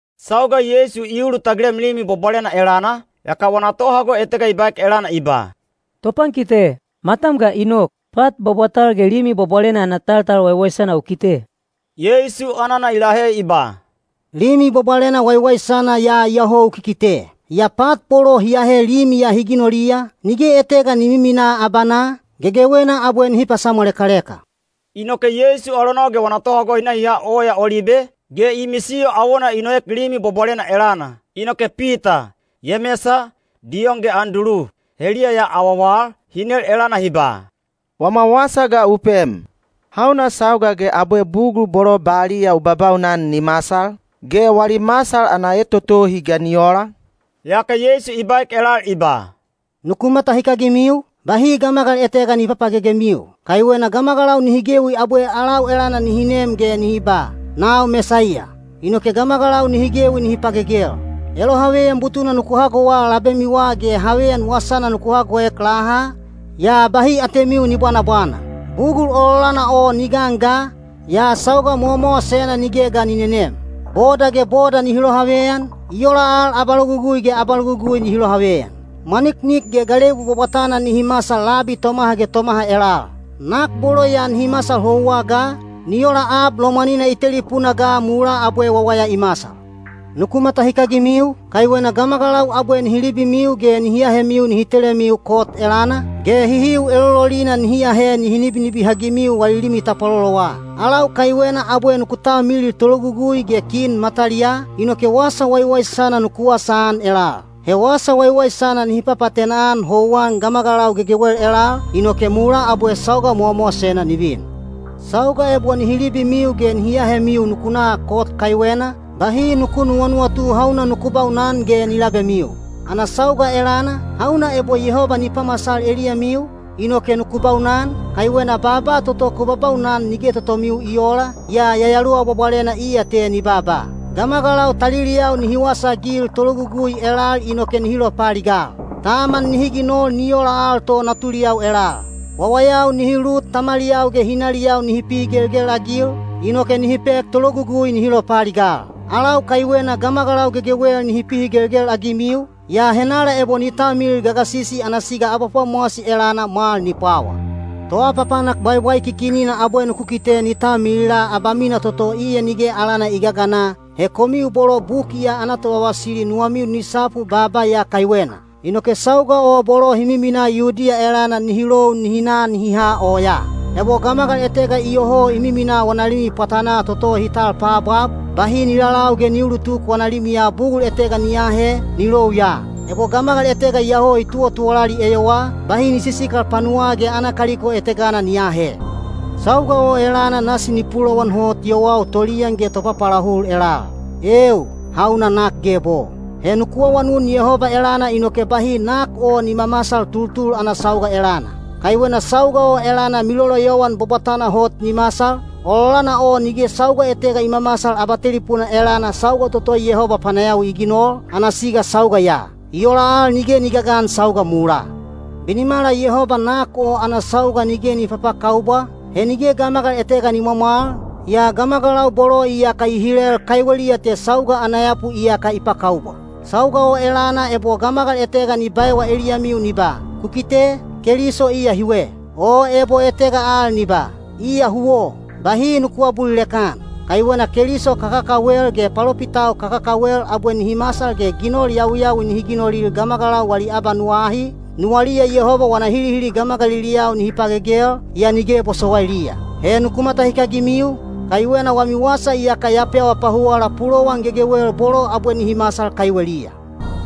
Sauga Yeisu i ulutagilem Limi Bwabwalena elana, yaka wana tohago etega i baek elana i ba, “Topankite, matam ga i nok! Pat bwabwatal ge Limi Bwabwalena ana taltal waiwaisana u kite!” Yeisu anana i lahe i ba, “Limi Bwabwalena waiwaisana ya iyoho u kikite. Yaa pat bolo hi ahe Limi ya hi ginoliya, nige etega ni miminaa abanaa, gegewena abwe nihi pasamwalekaleka.” Inoke Yeisu alonau ge wana tohago hi na hi ha Oya Olibe, ge i misiyo awona i noek Limi Bwabwalena elana. Inoke Pita, Yemesa, Diyon ge Andulu, heliya ya awawal, hi nel elana hi ba, “Wama wasa ga u pem, hauna sauga ge abwe bugul bolo baliya u babaunan ni masal? Ge wali masal ana etotohi ga ni ola?” Yaka Yeisu i baek elal i ba, “Nuku matahikagimiu, bahi gamagal etega ni papagegemiu. Kaiwena gamagalau nihi gewi abwe alau elana nihi nem ge nihi ba, ‘Nau Mesaiya!’ inoke gamagalau nihi gewi nihi pagegel. Elohaveyan butuna nuku hagowa labemiwa ge haveyan wasana nuku hagoek laha, yaa bahi atemiu ni bwanabwana. Bugul ololana o ni gan ga, yaa sauga mowamowasena nige ga ni nenem. Boda ge boda nihi lohaveyan, i ola al abalogugui ge abalogugui nihi lohaveyan. Mwaniknik ge galebu bwabwatana nihi masal labi tomaha ge tomaha elal. Nak bolo ya nihi masal houwa ga, ni ola ab lomwanina i telipuna ga mulaa abwe wawaya i masal. Nuku matahikagimiu, kaiwena gamagalau abwe nihi libimiu ge nihi ahemiu nihi telemiu kot elana, ge hihiu elololina nihi ahe nihi nibinibihagimiu wali limi tapwalolowa. Alau kaiwena abwe nuku talmilil tologugui ge kin mataliyaa, inoke wasa waiwaisana nuku wasaan elal. He wasa waiwaisana nihi papaatena-an houwan gamagalau gegewel elal, inoke mulaa abwe sauga mowamowasena ni vin. Sauga ebo nihi libimiu ge nihi ahemiu nuku na kot kaiwena, bahi nuku nuwanuwatu hauna nuku baunan ge ni labemiu. Ana sauga elana, hauna ebo Yehoba ni pamasal eliyamiu, inoke nuku baunan, kaiwena baaba toto ku babaunan nige totomiu i oola, yaa Yayaluwa Bwabwalena iya te ni baaba. Gamagalau taliliyau nihi wasaagil tologugui elal inoke nihi lopaaligal. Taman nihi ginol ni ola al to natuliyau elal. Wawayau nihi lut tamaliyau ge hinaliyau nihi pihigelgel-agil, inoke nihi pek tologugui nihi lopaaligal. Alau kaiwena gamagalau gegewel nihi pihigelgel-agimiu, yaa henala ebo ni talmilil gagasisi ana siga abapwamowasi elana mwal ni pwawa. ‘Toapapanak bwaibwaikikinina’ abwe nuku kite ni talmilila abamina toto iya nige alana i gagana—he komiu bolo buki ya ana tovavasili nuwamiu ni sapu baaba ya kaiwena. Inoke sauga o bolo hi miminaa Yudiya elana nihi lou nihi na nihi ha oyaa. Ebo gamagal etega iyoho i minamina wana limi pwatanaa toto hi tal paabwab, bahi ni lalau ge ni uulutuk wana limiya bugul etega ni aahe, ni lou ya. Ebo gamagal etega iyoho i tuwatuwalali eyowaa, bahi ni sisikal panuwaa ge ana kaliko etegana ni aahe. Sauga o elana nasi ni pulowan hot yowau toliyan ge topapaalahul elal. Eeu, hauna nak geb o! He nuku awanun Yehoba elana inoke bahi nak o ni mamasal tultul ana sauga elana. Kaiwena sauga o elana miloloyowan bwabwatana hot ni masal, ololana o nige sauga etega i mamasal abatelipuna elana sauga toto Yehoba panayawi i ginol, ana siga sauga ya. I ola al nige ni gagan sauga mulaa. Binimala Yehoba nak o ana sauga nige ni papakaubwa, he nige gamagal etega ni mwamwal, yaa gamagalau bolo iyaka i hilel kaiweliya te sauga ana yapu iyaka i pakaubwa. Sauga o elana ebo gamagal etega ni baewa eliyamiu ni ba, ‘Ku kite, Keliso iya hiwe,’ o ebo etega al ni ba, ‘Iya huwo,’ bahi nuku aabulilek-an. Kaiwena keliso kakakawel ge palopitau kakakawel abwe nihi masal ge ginol yawiyawi nihi ginolil gamagalau wali abanuwa ahi, nuwaliya Yehoba wana hilihili gamagaliliyau nihi pagegel, yaa nige bosowailiya. He nuku matahikagimiu, kaiwena wami wasa iyaka ya pewa pahuwala pulowan gegewel bolo abwe nihi masal kaiweliya.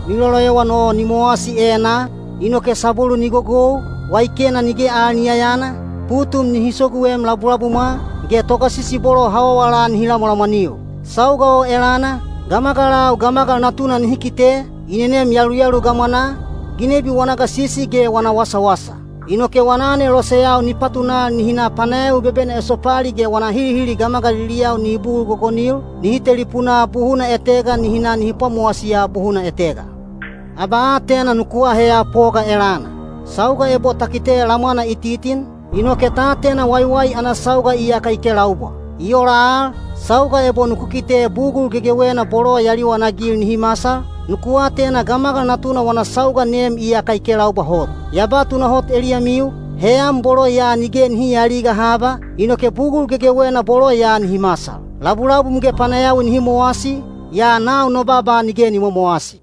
Miloloyowan o ni mowasi enaa, inoke sabwelu ni gogou, waikena nige al ni yayana, putum nihi soguem labulabumwa, ge togasisi bolo hawawala nihi lamwalamwaniu. Sauga o elana, gamagalau Gamagal Natuna nihi kite, i nenem yaluyalu gamwanaa, ginebi wana gasisi ge wana wasawasa. Inoke wana aneloseyau ni patunal nihi na panayawi bebena esopali ge wana hilihili gamagaliliyau nihi bugul gogonil, nihi telipunaa buhuna etega nihi na nihi pwamowasiya buhuna etega. Abaatena nuku aheya poga elana. Sauga ebo ta kite lamwana i titin, inoke ta atena waiwai ana sauga iyaka i kelaubwa. I ola al, sauga ebo nuku kite bugul gegewena bolo ya liwanagil nihi masal, nuku atena Gamagal Natuna wana sauga nem iyaka i kelaubwa hot. Ya ba tunahot eliyamiu, heyan bolo ya nige nihi aaliga haba, inoke bugul gegewena bolo ya nihi masal. Labulabum ge panayawi nihi mowasi, yaa nau no baaba nige ni momowasi.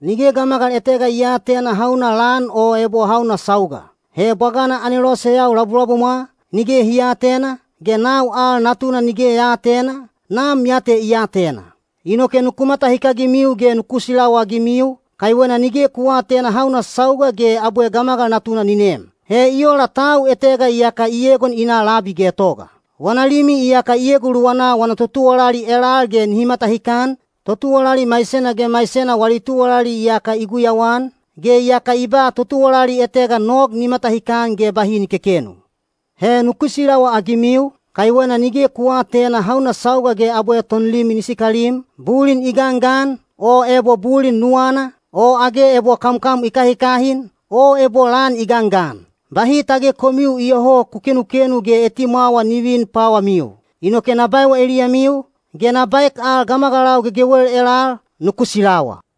Nige gamagal etega i aatena hauna lan o ebo hauna sauga. He bwagana aneloseyau labulabumwa, nige hi aatena, ge nau al Natuna nige ya aatena, Nam ya te i atena. Inoke nuku matahikagimiu ge nuku silawaagimiu, kaiwena nige ku aatena hauna sauga ge abwe Gamagal Natuna ni nem. He i ola tau etega iyaka i egon i na labi getoga: wana limi iyaka i eguluwana wana totuwalali elal ge nihi matahikan, totuwalali maisena ge maisena wali tuwalali iyaka i guyauan, ge iyaka i ba totuwalali etega nog ni matahikan ge bahi ni kekenu. He nuku silawaagimiu, kaiwena nige ku aatena hauna sauga ge abwe tonlimi ni sikalim, bulin i gangan, o ebo bulin nuwanaa, o age ebo kamkam i kahikahin, o ebo lan i gangan. Bahi tage komiu iyoho ku kenukenu ge etimwawa ni vin pwawamiu. Inoke na baewa eliyamiu, ge na baek al gamagalau gegewel elal, ‘Nuku silawa!’”